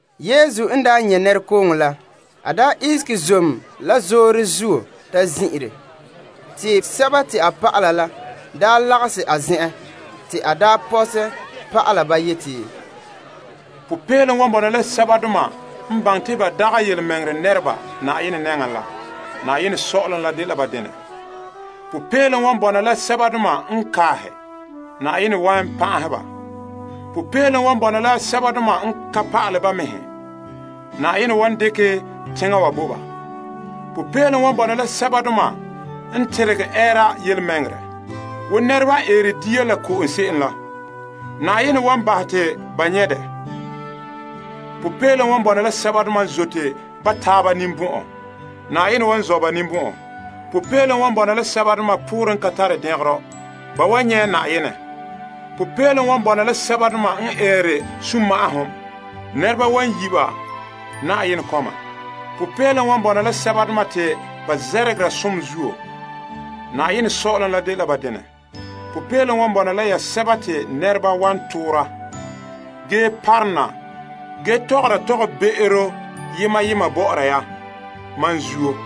Yesu n daa nyɛ' nɛrekooŋɔ la, a ihege zom la zoore zuo ta zin'ire. Te a dɔlɔba sɛba n dole a pa'alegɔ la lagahɛ a zen'en na, te a pɔhɛ pa'alɛ ba yeti: Som wan bɔna la sɛbadoma n baŋɛ te ba dagɛ tontɔɔdoma la, saazuo sɔ'ɔlom la dela ba denɛ. Som wan bɔna la sɛbadoma n kele. Yenɛ wan pan'ahɛ ba. Som wan bɔna la sɛbadoma n sigehe ba mɛhe, Yenɛ wan dekɛ teŋa wa bo ba. Som wan bɔna la sɛbadoma n teregɛ ɛɛra tontɔɔ bɔŋa wo nɛreba n eere dia la ko'om se'em la, Yenɛ wan bahɛ te ba nyɛ' dɛ. Som wan bɔna la sɛbadoma n zote ba taaba ninbɔn'ɔn, Yenɛ wan zɔ' ba ninbɔn'ɔn. Som wan bɔna la sɛbadoma poorɛ n ka tare dɛngerɔ, ba wan nyɛ' Yenɛ. Som wan bɔna la sɛbadoma n eere sunma'ahom, nɛreba wan yi' ba Yenɛ kɔma. Som wan bɔna la sɛbadoma te ba zɛrɛgera tontɔɔ bɔŋa zuo, Yenɛ Sɔ'ɔlom la dela ba denɛ. Som wan bɔna la ya sɛba te nɛreba wan toora ge parona ge tɔgɔra yetɔgɔbe'ero bɔ'ɔra ya, mam zuo.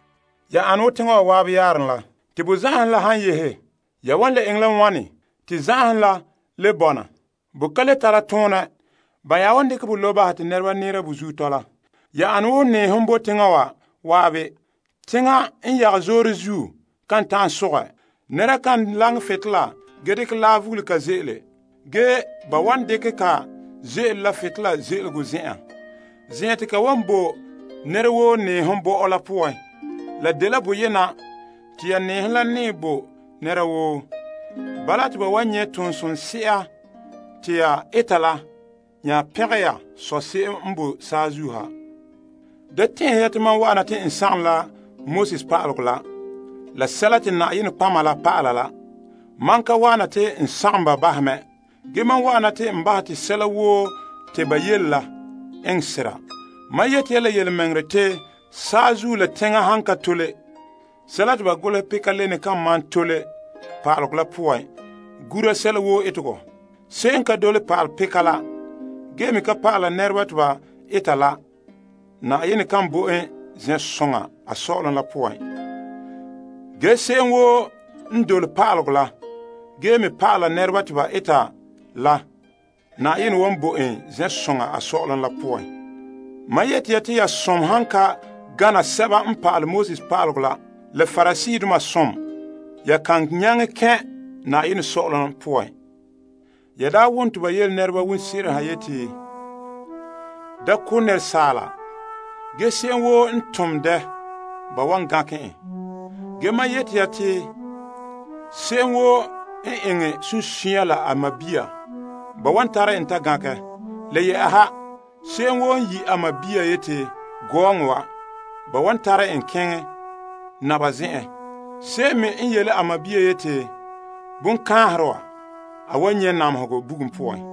Ya ane wo teŋa wa zan'an yaarom la. Te bo zan'anhom la han yehe, ya wan le eŋɛ la wane te zan'anhom la le bɔna? Bo ka le tara toonɛ. Ba nya wan dekɛ bo lobe bahɛ te nɛreba nɛɛra bo zuo tɔla. Ya ane wo nɛɛhom bo teŋa wa zan'an. Teŋa n yagɛ zoore zuo kan ta'an sogɛ. Nɛra kan laŋɛ butolela ge dekɛ laa vuge ka ze'ele. Ge ba wan dekɛ ka ze'ele la butolela ze'elego zen'en, zen'an te ka wan bo nɛra woo nɛɛhom bɔ'ɔ la poan. La dela boyena te ya nɛɛhom la nɛɛ bo nɛra woo. Bala te ba wan nyɛ' toon somse'a te ya eta la nya pɛngɛ ya Sɔ' se'em n boe saazuo ha. Da tɛn'ɛhɛ ya te mam wa'an na te n sagom sɛla te Pa'alegɔ la Nɔtɔgɔheba pa'ala la. Mam ka wa'ana te n sagom ba bahɛ mɛ, ge mam wa'ana te n bahɛ te sɛla woo te ba yele la enŋ sera. Mam yeti ya la yelemɛŋɛrɛ te, saazuo la teŋa han ka tole, sɛla te ba golehɛ peka le kan malom tole Pa'alegɔ la poan, gura sɛla woo etegɔ. Se'em n ka dole Pa'alegɔ peka la ge me ka pa'ala nɛreba te ba eta la, Yenɛ ka bo en zen'soŋa saazuo sɔ'ɔlom la poan. Ge se'em woo n dole Pa'alegɔ la, ge me pa'ala nɛreba te ba eta la, Yenɛ wan bo en zen'soŋa saazuo sɔ'ɔlom la poan. Mam yeti ya te ya birikinte han ka gana pa'alegɔ pa'aleba la Pariseedoma birikinte, ya kan nyaŋɛ kɛn' saazuo sɔ'ɔlom poan. Ya daa wom te ba daa yele nɛreba wonse'eren ha yeti, Da ko' nɛra, ge se'em woo n tom dɛ, ba wan gankɛ en. Ge, mam yeti ya te se'em woo n eŋɛ sunsunya la a sɔɔn, ba wan tare en ta gankɛ. Le yɛ'ɛha, se'em woo han yi' a sɔɔn yeti, Gɔɔŋɔ wa! Ba wan tare en keŋɛ Yetɔgom Tɔgɔrɔba zen'en. Se'em me n yele a sɔɔn yeti, Bongaaherɛ wa! A wan nyɛ' namehegɔ bugum poan.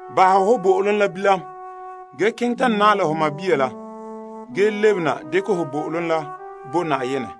bahɛ ho bo'olom la bilam ge keŋɛ ta naɛ la ho sɔɔn la ge lebena dekɛ ho bo'olom la bo Na'ayenɛ.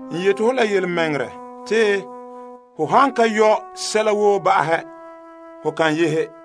N yeti ho la yelemɛŋɛrɛ te ho han ka yɔ' sɛla woo ba'ahɛ, ho kan yehe.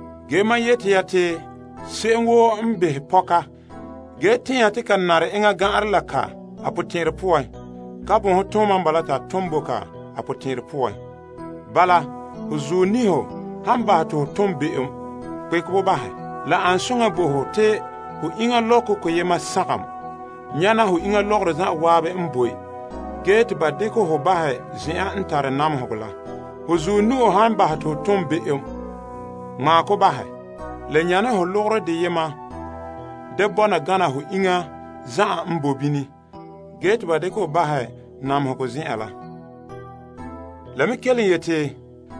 Ge mam yeti ya te se'em woo n behɛ pɔka, ge tɛn'ɛha te ka nare ne enŋa gan'anrɛ la ka a potɛn'ɛrɛ poan, pon gan'anrɛ ka mɛ n bala. Bala, ho zuɔ niho han bahɛ te ho tom be'em, kpekɛ bo bahɛ. La an soŋa bo ho te ho iŋa lɔkɔ koyema sagom nyana ho iŋa lɔgɔrɔ zan'an n boe, ge te ba dekɛ ho bahɛ zen'an n tare namehegɔ la. Ho zuɔ nu'o han bahɛ te ho tom be'em, ŋmaa kɔ bahɛ. La nyane ho lɔgɔrɛ deyema da bɔna gana ho iŋa zan'an n boe bini ge te ba dekɛ hɔ bahɛ namehegɔ zen'en la. La me kelom yeti,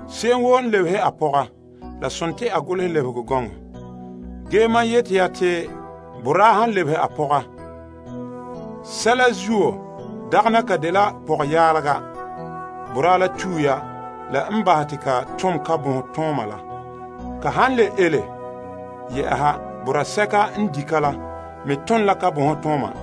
Se'em woo n lebehe a pɔga, la sontii a golehɛ pɔgɔlebehegɔ gɔŋɔ bo ka. Ge mam yeti ya te boraa han lebehe a pɔga la han dagɛna ka dagɛ birikina, boraa la tue ya la n bahɛ te ka tom yalomtooma la. Ka han le ele yɛ'ɛha, boraa sɛka n di' ka la me ton la yalomtooma.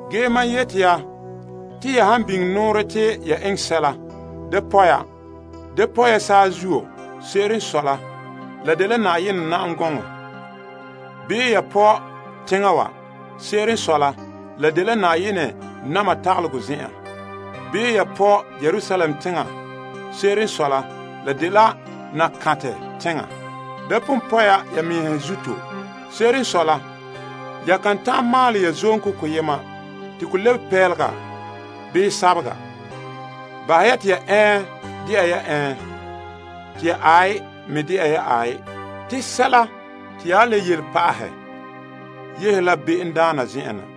Ge mam yeti ya te ya han biŋe nɔɔrɛ te ya eŋɛ sɛla, da pɔ' ya. Da pɔ' ya saazuo. Se'ere n sɔe la, la dela Yenɛ na'am gɔŋɔ. Da pɔ' ya teŋa wa. Se'ere n sɔe la, la dela Yenɛ na'ma tagalegɔ zen'an. Da pɔ' ya Yerusalem teŋa. Se'ere n sɔe la, la dela Nakantɛ teŋa. Da pon pɔ' ya ya mɛhe zuto. Se'ere n sɔe la, ya kan ta'an maalɛ ya zonto koyema te ko lebege pelega bii sabega. Bahɛ ya te ya Ɛɛn dɛna ya Ɛɛn, te ya Aai me dɛna ya Aai. Te sɛla te ya le yele pa'ahɛ yehe la bonbe'a la zen'en na.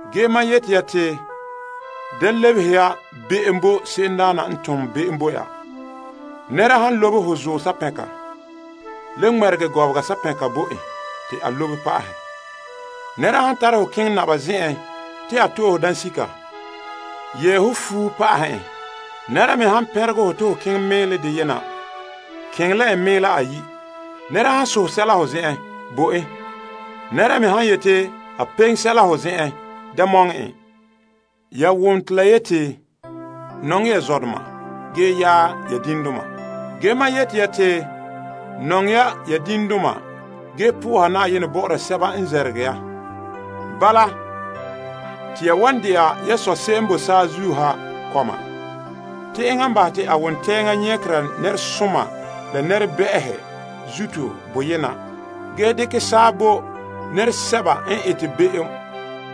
Ge mam yeti ya te, da lebehe ya be'em bo se'emdaana n tom be'em bo ya. Nɛra han lobe ho zuɔ sapɛnka, le ŋmɛregɛ gɔbega sapɛnka bo en te a lobe pa'ahɛ. Nɛra han tare ho keŋɛ naba zen'en te a to'e ho dansika, yɛɛ ho banaa la pa'ahɛ en. Nɛra me han pɛnregɛ hɔ te ho keŋɛ mɛɛlɛ deyena, keŋɛ la en mɛɛla ayi'. Nɛra han sohɛ sɛla ho zen'en, bo en. Nɛra me han yeti a peŋe sɛla ho zen'en, da mɔŋɛ en. Ya wom te la yeti, Ton nɔŋɛ ho tadaana, ge yaɛ ho diŋdoma. Ge mam yeti ya te, nɔŋɛ ya diŋdoma ge soha Na'ayenɛ bɔ'ɔra sɛba n zɛrɛgere ya. Bala, te ya wan dɛna ya Sɔ' se'em n boe saazuo ha kɔma. Te enŋa n bahɛ te a wontɛɛŋa nyagera nɛresoma la nɛrebɛ'ɛhe zuto boyena ge bɔ'ɔra nɛresoma la sɛba n tone be'em saa.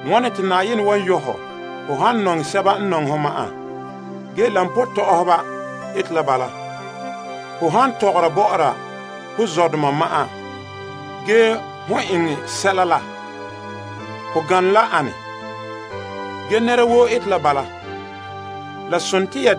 Wane te Yenɛ wan yɔ' hɔ, hom han nɔŋɛ sɛba n nɔŋɛ hɔ ma'an? Sɛba n to'ohere koba ane la bala. Ho han tɔgɔra bɔ'ɔra ho zɔdoma ma'an, hon eŋɛ sɛla la, ho nyane la ane? Sɛba n ka mi Yenɛ pon eta bala mɛ.